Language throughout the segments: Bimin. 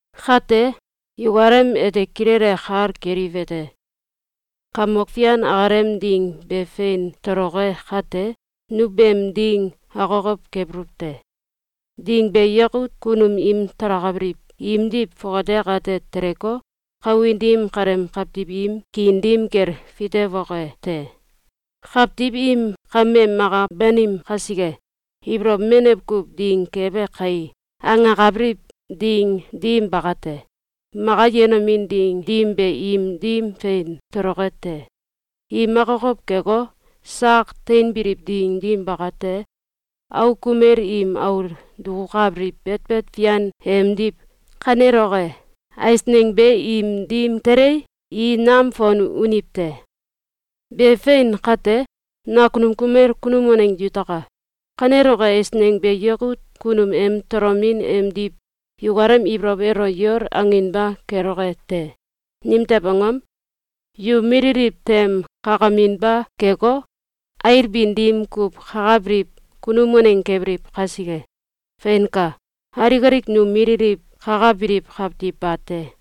Kate, yukalem ete kilele kal keliwete: Kamok Fian akalem Ding be fein toloke kate, nu beem ding akokow kebuluw te. Ding be yakut kunum im talakabiliw imdiw fongate akate teleko, kawin dim kaleem kawtiw im kiin dim kel fitewoke te. Kawtiw im “Kame maka banim kasike, ibolow menew kuw ding kebe kai!”, angakabiliw ding dim bakate, maka yenomin ding dim be im dim fein toloke te. Im akokow keko, sak teinbiliw ding dim bakate, auk kumel im aul dukukabiliw betbet fian emdiw kaneloke eisneng be im dim telei, i nam fon uniw te. Be fein kate, nakunum kumel kunum waneng yutaka! Kaneloke eisneng be yakut kunum em tolomin emdiw yukalem ibolow elo yol anginba keloke te. Nimtew angom? Yu mililiw tem kakaminba keko, ailbin dim kuw kakabiliw kunum waneng kebiliw kasike. Feinka! Alik alik nu mililiw kakabiliw kawtiw bate.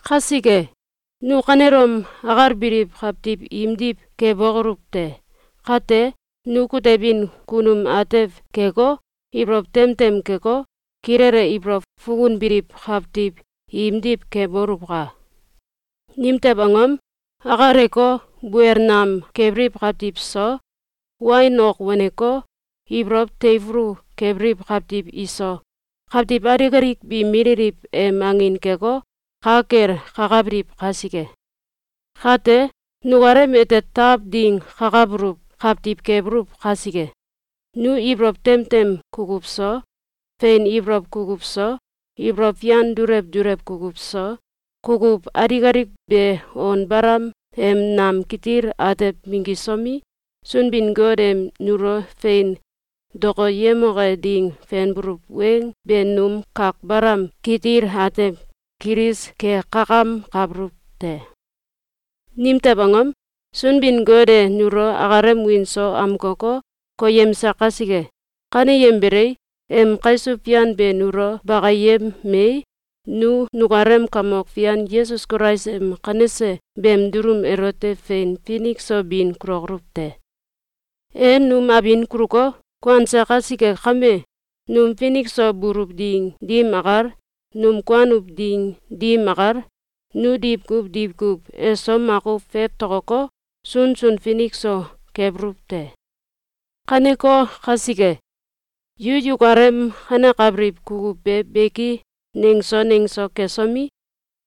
Kasike, nu kanelom akalbiliw kawtiw imdiw kebokoluw te! Kate, nu kutebin kunum atew keko, ibolow tem tem keko, kilele ibolow fukunbiliw kawtiw imdiw keboluwka! Nimtew angom? Akaleko, buel nam kebiliw kawtiw so, wain ok waneko, ibolow teifulu kebiliw kawtiw iso, kawtiw alik alik bi mililiw em angin keko, ka kel kakabiliw kasike. Kate, nukalem ete taw ding kakabuluw kawtiw kebuluw kasike, nu ibolow tem tem kukuw so, fein ibolow kukuw so, ibolow fian dulew dulew kukuw so, kukuw alik alik be on balam em nam kitil atew minggisomi, Sunbin-Got em nulo fein dokoyemoke ding fenbuluw weng be num kak balam kitil atew kilis kekakamkabuluw te. Nimtew angom? Sunbin-Got e nulo akalem wiin so amkoko, koyemse kasike. Kaneyembelei, em kaisuw fian be nulo bakiyemei, nu nukalem Kamok Fian Yesus Kulais em kanese beem dulum elote fein finik so bin kulokoluw te. E num abin kuluko, kuanse kasike kame, num finik so buluw ding dim akal, num kuanuw ding dim akal, nu diwkuw diwkuw eso makuw fewtokoko, sunsun finik so kebuluw te. Kaneko kasike, yu yukalem kanekabiliw kukuw be beki nengso nengso kesomi,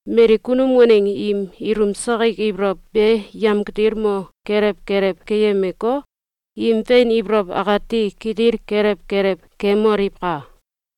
mali kunum waneng im ilum sakik ibolow be yemkitilmo kelew kelew keyemeko, im fein ibolow akati kitil kelew kelew kemoliwka!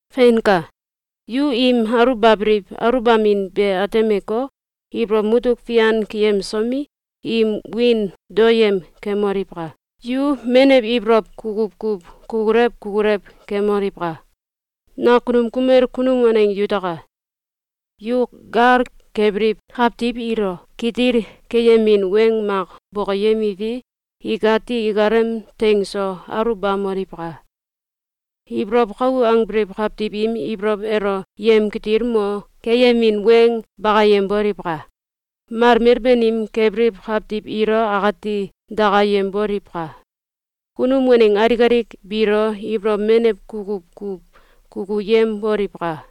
Feinka! Yu im aluwbabiliw aluwbamin be atemeko, ibolow mutuk fian keyemsomi, im wiin daoyem kemoliwka! Yu menew ibolow kukuw kuw kukulew kukulew kemoliwka! Nakunum kumel kunum waneng yutaka! Yu gal kebiliw kawtiw ilo kitil keyemin weng mak bokoyemiwi, ikati ikalem teing so aluwbamoliwka! Ibolow kau angbiliw kawtiw im ibolow elo yemkitilmo keyemin weng bakayemboliwka! Malmel banim kebiliw kawtiw ilo akati dakayemboliwka! Kunum waneng alik alik biilo ibolow menew kukuw kuw kukuyemboliwka!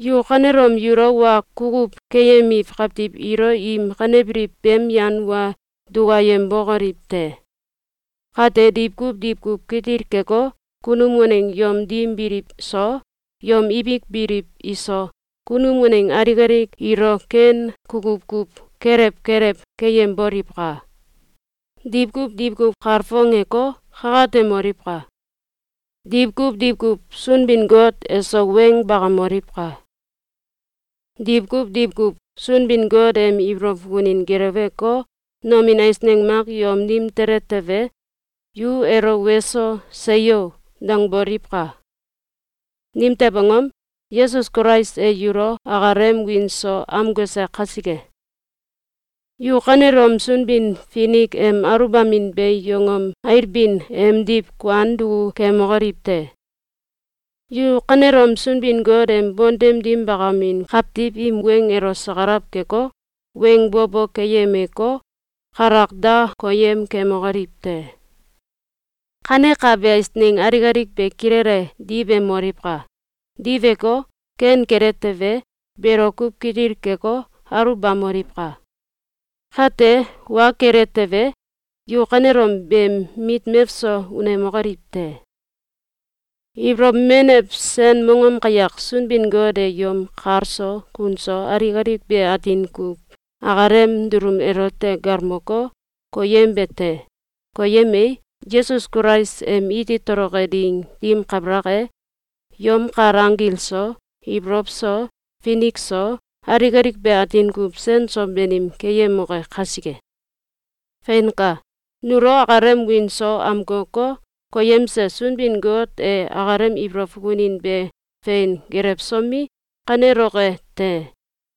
Yu kanelom yulo wa kukuw keyemiw kawtiw ilo im kanebiliw beem yan wa dukayembokoliw te! Kate diwkuw diwkuw kitil keko, kunum waneng yom dim biliw so, yom ibik biliw iso, kunum waneng alik alik ilo ken kukuw kuw kelew kelew keyemboliwka! Diwkuw diwkuw kalfongeko, kakatemoliwka! Diwkuw diwkuw Sunbin-Got eso weng bakamoliwka! Diwkuw diwkuw Sunbin-Got em ibolow fukunin gelewko, nomin eisneng mak yom dim tele tewe, yu elo “Weso! Seyo!”, dangboliwka! Nimtew angom? Yesus Kulais e yulo akalem wiin so amkose kasike. Yu kanelom Sunbin-Finik em aluwbamin be yongom ailbin emdiw kuan duku kemokoliw te! Yu kanelom Sunbin-Got em bontem dim bakamin kawtiw im weng elo sakalaw keko, weng bo bo keyemeko, kalak da koyem kemokoliw te! Kanekabe eisneng alik alik be kilele diwemoliwka! Diweko, ken kele tewe, belo kuw kitil keko, aluwbamoliwka! Kate, wa kele tewe, yu kanelom beem mit mewso unemokoliw te! Ibolow menew sen mongom kayak Sunbin-Got e yom kal so kun so alik alik be atin kuw akalem dulum elote galmoko, koyembe te! Koyemei, Yesus Kulais em iti toloke ding dim kabalak e, yom kal anggil so, ibolow so, finik so, alik alik be atin kuw sen so banim keyemoke kasike. Feinka! Nulo akalem wiin so amkoko, koyemse Sunbin-Got e akalem ibolow fukunin be fein gelewsomi, kaneloke te.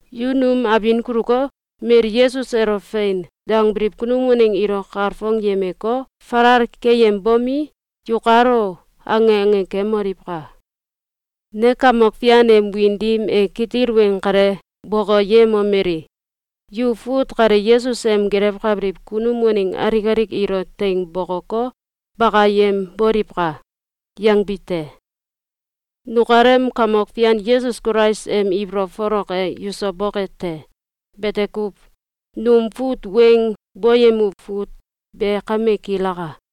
Yu num abin kuluko, mali Yesus elo “Fein!”, dangbiliw kunum waneng ilo kalfongyemeko, falal keyembomi, “Yukalo!”, ange ange kemoliwka! Ne Kamok Fian em wiin dim e kitil weng kale bokoyemomeli: “Yu fut kale Yesus em gelewkabiliw kunum waneng alik alik ilo teing bokoko, bakayemboliwka!”, yangbi te. Nukalem Kamok Fian Yesus Kulais em ibolow folok e yuso boke te! Bete kuw. Num fut weng boyemuw fut be kame kilaka.